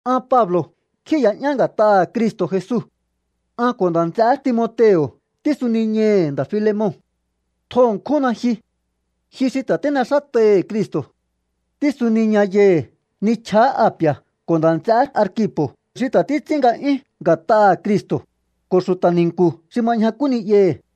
An Pablo̱ kjíi̱ya'yán nga̱t'aha̱ Cristo̱ Jesu. An ko̱ nda̱ nts'eé Timoteo̱ tísuniñai̱hi̱ nda̱ Filemon. Tjo ṉkjúnna ji. Ji xi ta̱ tín'exát'aihi̱ Cristo̱. Tísuniña yai̱hi̱ nichjaá Api̱a̱, ko̱ nda̱ nts'eé Arkipo̱ xi ta̱ títs'ín nga'yún nga̱t'aha̱ Cristo̱, ko̱ xu̱ta̱ ni̱nku̱ xi ma ñjakú ni'yahi̱.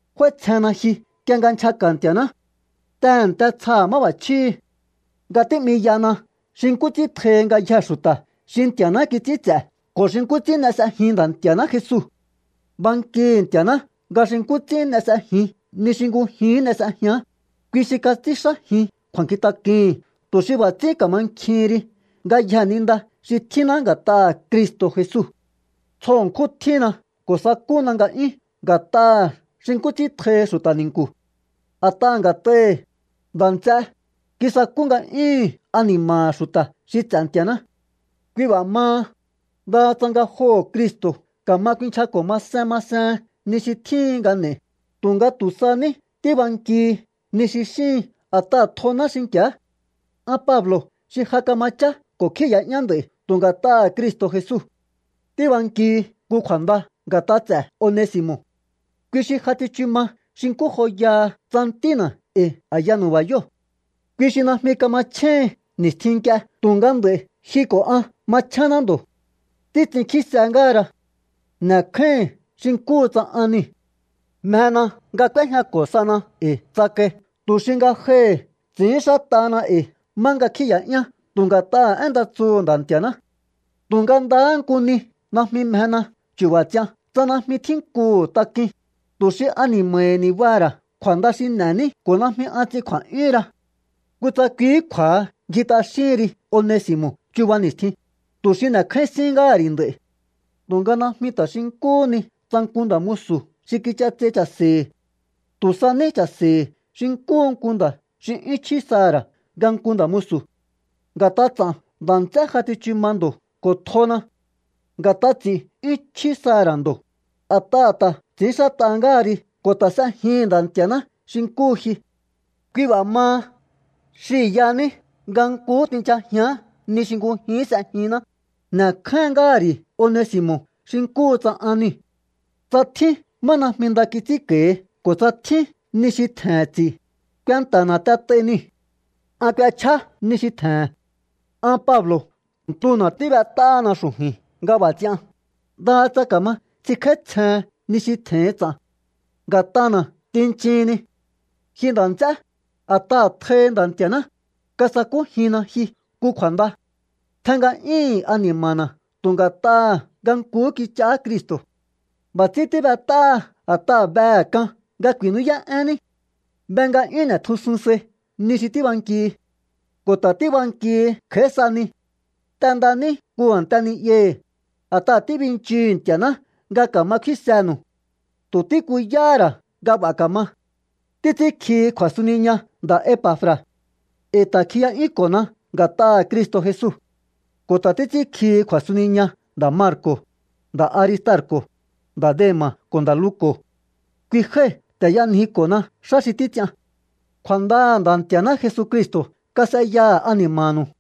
F'áítsjenna ji nk'ie nga nchjaka̱ Nti̱a̱ná. Tehe̱nte tsja máb'a̱chjíhi̱ nga tí'miyana xi nkú ts'ín tjohi ngayjee̱ xu̱ta̱ xi Nti̱a̱ná kits'ín ts'e̱ ko̱ xi nkú ts'ín n'e s'ejin Nda̱ Nti̱a̱ná Jesu. Bankihi̱ Nti̱a̱ná nga xi nkú ts'ín n'e s'ejin ni xi ngujihín n'e s'ejián, kui xi kats'ínxájin kju̱a̱nkjintak'uhi̱n tu̱ xi b'a̱ ts'ín ka̱mankjihin ri ngayjee̱ ni nda xi tjínná nga̱t'aha̱ Cristo̱ Jesu. Tsjo ṉkjún tjínna ko̱ sakúna nga'yún nga̱t'aha̱ xi nkú ts'ín tjohi xu̱ta̱ ni̱nku̱. A̱t'aha̱ nga̱t'ahi̱, nda̱ nts'é, kisakú nga'yúhu̱n ani̱ma̱ha̱ xu̱ta̱ xi ts'e̱ Nti̱a̱ná. Kui b'a̱ maha, ndaha tsa ngajoho̱ Cristo̱ ka̱ma kuinchjako̱ masen masehen ni xi tjíhin nga n'e̱i, tu̱nga tu̱ sa ní tíbankihi ni xi xíhin a̱t'aha̱ tjoná xinki̱á. An Pablo̱ xi ja kama chá ko̱ kjíi̱ya'yán nd'a̱i̱ tu̱ nga̱t'aha̱ Cristo̱ Jesu tíbankihi nku kju̱a̱nda nga̱t'a ts'e̱ Onesi̱mo̱. Kui xi ja tsichu ma xi nkú joyaha tsa ntína̱ e̱i̱ a̱ya nu̱ba̱yóo̱. Kui xi najmi kamachjéhin ni̱stjin nk'ie tu̱nga nd'a̱i̱ ji ko̱ an machénná ndo̱. Títs'inkjíse ngáhara. N'e̱kjáíhi̱n xi nkúhu tsa an niu̱. Mjena nga k'úéjñako̱ sana e̱i̱ tsakai tu̱ xi ngajohi̱ ts'i̱ínxát'ahana e̱i̱ má nga kjíi̱ya'yán tu̱ nga̱t'aha̱ én nda tsuhu̱ Nda̱ Nti̱a̱ná. Tu̱nga ndahá nku ni najmi mjena chu̱ba̱ ts'ian tsa najmi tjínkuhu̱ tak'uin, tu̱ xi ani̱ma̱hi̱ ni̱baha̱ ra̱ kju̱a̱nda xi n'e̱ní ko̱ najmi an ts'in kju̱a̱'yúhunra. Kutsa kuihí kju̱a̱ha ngji t'axíhin ri Onesi̱mo̱ chuba ni̱stjin, tu̱ xi n'e̱kjáín sín ngáha̱ ri̱ nd'a̱i̱. Tu̱nga najmi ta̱ xi nkúhú ni tsa nku nda̱ musu̱ xi kich'atsei cha̱se̱hi̱. Tu̱ sa ní cha̱se̱hi̱ xi nkúhu nku nda̱ xi 'yún chjí saha̱ ra̱ nga nku nda̱ musu̱. Nga̱t'a ts'a̱n nda̱ts'é ja tsichu ma ndo̱ ko̱ tjona. Nga̱t'a ts'i̱ 'yún chjí saha̱ ra̱ ndo̱, a̱t'aha̱ ta̱ ts'i̱ínxát'a ngáha ri ko̱ ta̱ s'ejihi̱n Nda̱ Nti̱a̱ná xi nkúhu ji. Kui b'a̱ maha, xihi̱ yaní nga nkuhú tinchajián ni xi ngujihín s'ejinná, n'e̱kjáín ngáha̱ ri̱ Onesi̱mo̱ xi nkúhu tsa an niu̱. Tsa tjín má najmi nda kits'ínko̱hi ko̱ tsa tjín ni xi tje̱he̱n ts'i̱, kuenta̱na̱ t'et'ai niu̱. An k'uechjá ni xi tje̱he̱n. An Pablo̱ ntuna̱ tíb'et'áhana xu̱ju̱i̱n nga b'a̱ ts'ian, ndaha tsa ka̱ma ts'inkj'áítsjehen ni xi tje̱hin ts'a̱n. Nga̱t'ana̱ tinchihinni. Ji nda̱ nts'e, a̱t'aha̱ tjohi̱ Nda̱ Nti̱a̱ná, kasakújinna ji nku kju̱a̱nda. Tjen nga'yíhi̱n ani̱ma̱na̱ tu̱ nga̱t'aha̱ nga nkuhú kich'aá Cristo̱. B'a̱ ts'ín tíb'et'áha a̱t'aha̱ behe̱ k'an nga ku̱i̱nú'yá'énní. Be nga 'yún n'e̱tjusun sai ni xi tíbankihi. Ko̱ ta̱ tíbankihi kj'a̱í sa ni. T'endaní nku a̱nte ni'yahi̱, a̱t'aha̱ tíbinchihu̱u Nti̱a̱ná nga ka̱ma kfínsenu̱u. Tu̱ tíkuyáhá ra̱ nga b'a̱ ka̱ma. Títs'ínkjihi kju̱a̱suniña nda̱ Epa̱fra̱. E̱i̱ ta̱ kjiya'yúnko̱na nga̱t'aha̱ Cristo̱ Jesu. Ko̱ ta̱ títs'ínkjihi kju̱a̱suniña nda̱ Marko̱, nda̱ Aristarko̱, nda̱ Dema̱ ko̱ nda̱ Luko̱. Kui jái̱ ta̱ y'anjiko̱na xá xi títs'ian. Kju̱a̱ndaha̱ Nda̱ Nti̱a̱ná Jesucristo̱ kas'eyaha̱ ani̱ma̱nu̱u.